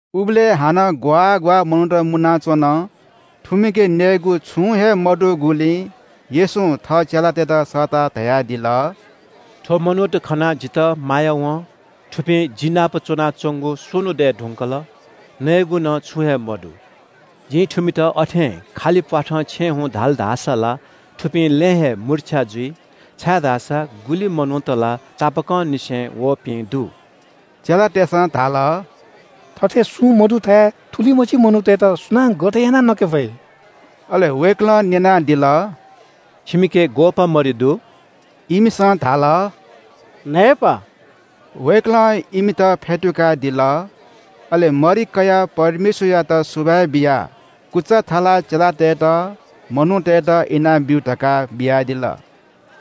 उबलय् हानं ग्‍वाः ग्‍वाः मनूत मुनाच्‍वन। थुमिके नयेगु छुं हे मदुगुलिं येशूं थः चेलातय्‌त सःताः धयादिल – “थ्‍व मनूत खनाः जितः माया वं। थुपिं जि नाप च्‍वनाच्‍वंगु स्‍वन्‍हु दय् धुंकल। नयेगु नं छुं हे मदु। जिं थुमित अथें खालि प्‍वाथं छेँ हुँ धाल धाःसा ला थुपिं लँय् हे मुर्छ्या जुइ, छाय्‌धाःसा गुलि मनूत ला तापाकंनिसें वःपिं दु।” चेलातय्‌सं धाल – “थथे सुं मदुथाय् थुलिमछि मनूतय्‌त सुनां गथे यानाः नके फइ?” अले वय्‌कलं न्‍यनादिल – “छिमिके ग्‍वःपाः मरि दु?” इमिसं धाल – “न्‍हय्‌पाः।” वय्‌कलं इमित फ्‍यतुकादिल। अले मरि कयाः परमेश्‍वरयात सुभाय् बियाः कुचा थलाः चेलातय्‌त मनूतय्‌त इनाब्‍यु धकाः बियादिल।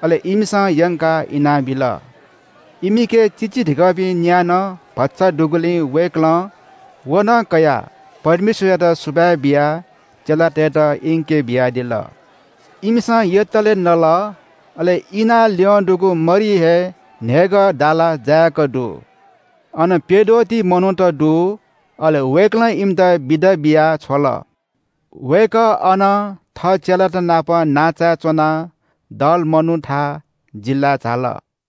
अले इमिसं यंकाः इनाबिल। इमिके चिचीधिकःपिं न्‍या नं भचा दुगुलिं वय्‌कलं व नं कयाः परमेश्‍वरयात सुभाय् बियाः चेलातय्‌त इंके बियादिल। इमिसं यतले नल। अले इनाः ल्‍यं दुगु मरि हे न्‍हय्‌गः दाला जायेक दु। अन प्‍यद्वः ति मनूत दु। अले वय्‌कलं इमित बिदा बियाः छ्वल। वय्‌कः अनं थः चेलात नाप नांचाय् च्‍वनाः दलमनुथा जिल्‍लाय् झाल।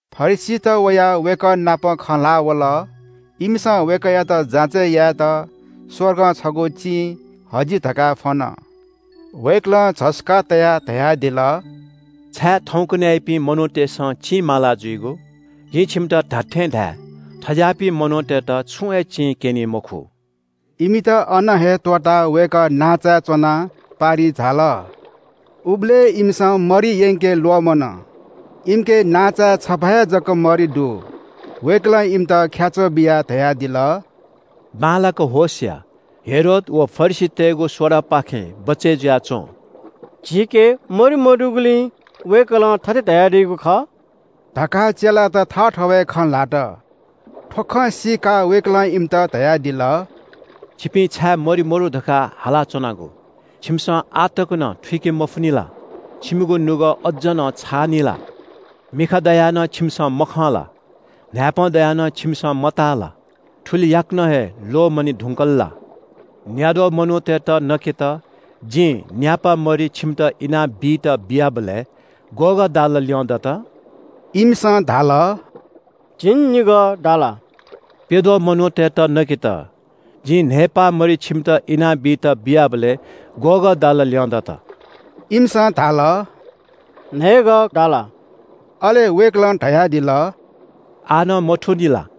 फरिसीत वयाः वय्‌कः नाप खँ ल्‍हाः वल। इमिसं वय्‌कःयात जाँचय् यायेत स्‍वर्गं छगू चिं हजि धकाः फ्‍वन। वय्‌कलं झसुकाः तयाः धयादिल – “छाय् थौंकन्‍हय्‌यापिं मनूतय्‌सं चिं माला जुइगु? जिं छिमित धात्‍थें धाये – थज्‍याःपिं मनूतय्‌त छुं हे चिं क्‍यनी मखु।” इमित अन हे त्‍वःताः वय्‌कः नांचाय् च्‍वनाः पारिइ झाल। उबलय् इमिसं मरि यंके ल्‍वःमन। इमिके नांचाय् छपा हे जक मरि दु। वय्‌कलं इमित ख्‍याच्‍वः बियाः धयादिल – “बांलाक होश या, हेरोद व फरिसीतय्‌गु सोडापाखें बचय् जुयाच्‍वँ।” “झीके मरि मदुगुलिं वय्‌कलं थथे धयादीगु खः?” धकाः चेलात थःथवय् खँ ल्‍हात। थ्‍व खँ सीकाः वय्‌कलं इमित धयादिल – “छिपिं छाय् मरि मदु धकाः हालाच्‍वनागु? छिमिसं आः तक नं थुइके मफुनि ला? छिमिगु नुगः अज्‍ज नं छाःनि ला? मिखा दयाः नं छिमिसं मखं ला? न्‍हाय्‌पं दयाः नं छिमिसं मताः ला? थुलि याकनं हे ल्‍वःमने धुंकल ला? न्‍याद्वः मनूतय्‌त नकेत जिं न्‍यापा मरि छिमित इनाबीत बियाबलय्, ग्‍वःगः दाला ल्‍यं दत?” इमिसं धाल – “झिंनिगः दाला।” “प्‍यद्वः मनूतय्‌त नकेत जिं न्‍हय्‌पाः मरि छिमित इनाबीत बियाबलय् ग्‍वःगः दाला ल्‍यं दत?” इमिसं धाल – “न्‍हय्‌गः दाला।” अले वय्‌कलं धयादिल – “आः नं मथूनि ला?”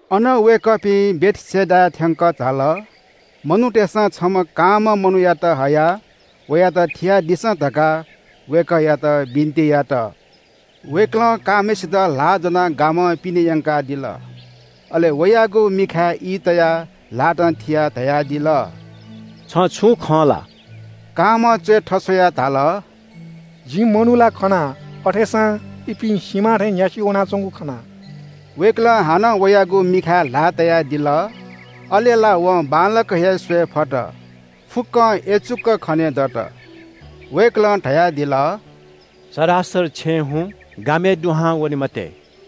अनं वय्‌कःपिं बेथसेदाय् थ्‍यंकः झाल। मनूतय्‌सं छम्‍ह कांम्‍ह मनूयात हयाः वयात थियादिसँ धकाः वय्‌कःयात बिन्‍ति यात। वय्‌कलं कांम्‍हय्‌सित ल्‍हाः ज्‍वनाः गामं पिने यंकादिल। अले वयागु मिखाय् ई तयाः ल्‍हातं थियाः धयादिल – “छं छुं खं ला?” कांम्‍हं च्‍वय् थस्‍वयाः धाल – “जिं मनू ला खना अथेसां इपिं सिमा थें न्‍यासि वनाच्‍वंगु खना।” वय्‌कलं हानं वयागु मिखाय् ल्‍हाः तयादिल। अले ला वं बांलाक हे स्‍वये फत, फुक्‍कं यचुक खनेदत। वय्‌कलं धयादिल – “सरासर छेँ हुँ, गामय् दुहां वने मते।”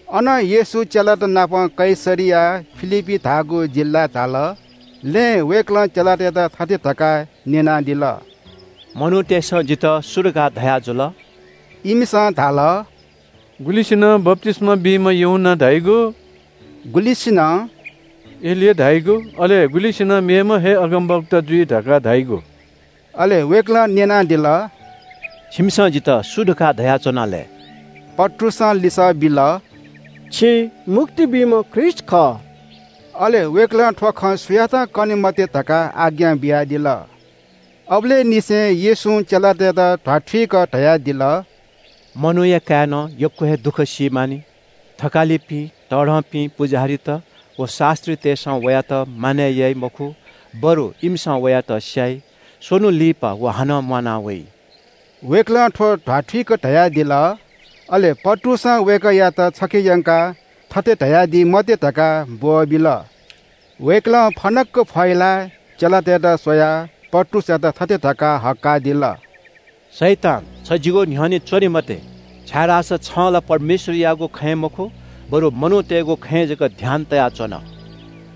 अनं येशू चेलातनापं कैसरिया फिलिप्‍पी धाःगु जिल्‍लाय् झाल। लँय् वय्‌कलं चेलातय्‌त थथे धकाः न्‍यनादिल – “मनूतय्‌सं जितः सु धकाः धयाजुल?” इमिसं धाल – “गुलिसिनं बप्‍तिस्‍मा बीम्‍ह यूहन्‍ना धाइगु,” गुलिसिनं “एलिया धाइगु, अले गुलिसिनं मेम्‍ह हे अगमवक्ता जुइ धकाः धाइगु।” अले वय्‌कलं न्‍यनादिल – “छिमिसं जितः सु धकाः धयाच्‍वना लय्?” पत्रुसं लिसः बिल – “छि मुक्ति बीम्‍ह ख्रीष्‍ट खः।” अले वय्‌कलं थ्‍व खँ सुयातं कने मते धकाः आज्ञा बियादिल। अबलय् निसें येशूं चेलातय्‌त ध्‍वाथुइक धयादिल – “मनूया काय्‌नं यक्‍व हे दुःख सी मानि। थकालिपिं, तःधंपिं पुजाहारीत व शास्‍त्रीतय्‌सं वयात मानय् याइ मखु, बरु इमिसं वयात स्‍याइ। स्‍वन्‍हु लिपा व हानं म्‍वाना वइ।” वय्‌कलं थ्‍व ध्‍वाथुइक धयादिल। अले पत्रुसं वय्‌कःयात छखे यंकाः थथे धयादी मते धकाः ब्‍वःबिल। वय्‌कलं फनक्‍क फहिलाः चेलातय्‌त स्‍वयाः पत्रुसयात थथे धकाः हक्‍कादिल – “शैतान, छ जिगु न्‍ह्यःने च्‍वने मते, छाय्‌धाःसा छं ला परमेश्‍वरयागु खँय् मखु, बरु मनूतय्‌गु खँय् जक ध्‍यान तयाच्‍वन।”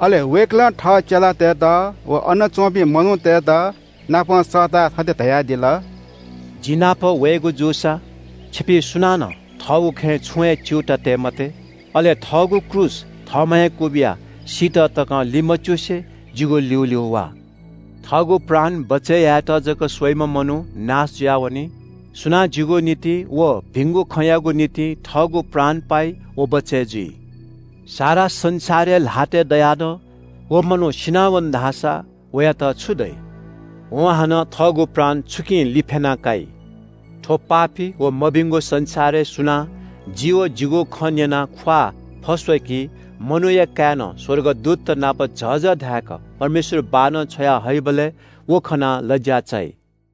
अले वय्‌कलं थः चेलातय्‌त व अन च्‍वंपिं मनूतय्‌तनापं सःताः थथे धयादिल – “जि नाप वयेगु जूसा छिपिं सुनानं थःगु खँय् छुं हे च्‍यूताः काये मते। अले थःगु क्रूस थःम्‍हं हे क्‍वबिया सीत तकं लिमच्‍युसे जिगु ल्‍यूल्‍यू वा। थःगु प्राण बचय् यायेत जक स्‍वइम्‍ह मनू नाश जुयावनी। सुनां जिगु निंतिं व भिंगु खँयागु निंतिं थःगु प्राण पाइ व बचय् जुइ। सारा संसार हे ल्‍हातय् दयाः नं व मनू सिनावन धाःसा वयात छु दइ? वं हानं थःगु प्राण छुकिं लिफ्‍याना काइ? थ्‍व पापी व मभिंगु संसारय् सुनां जि व जिगु खँ न्‍यनाः ख्‍वाः फस्‍वय्‌की मनूया काय्‌नं स्‍वर्गदूतत नाप झःझः धाय्‌क परमेश्‍वर बाःनं छ्वया हइबलय् व खनाः लज्‍या चाइ।”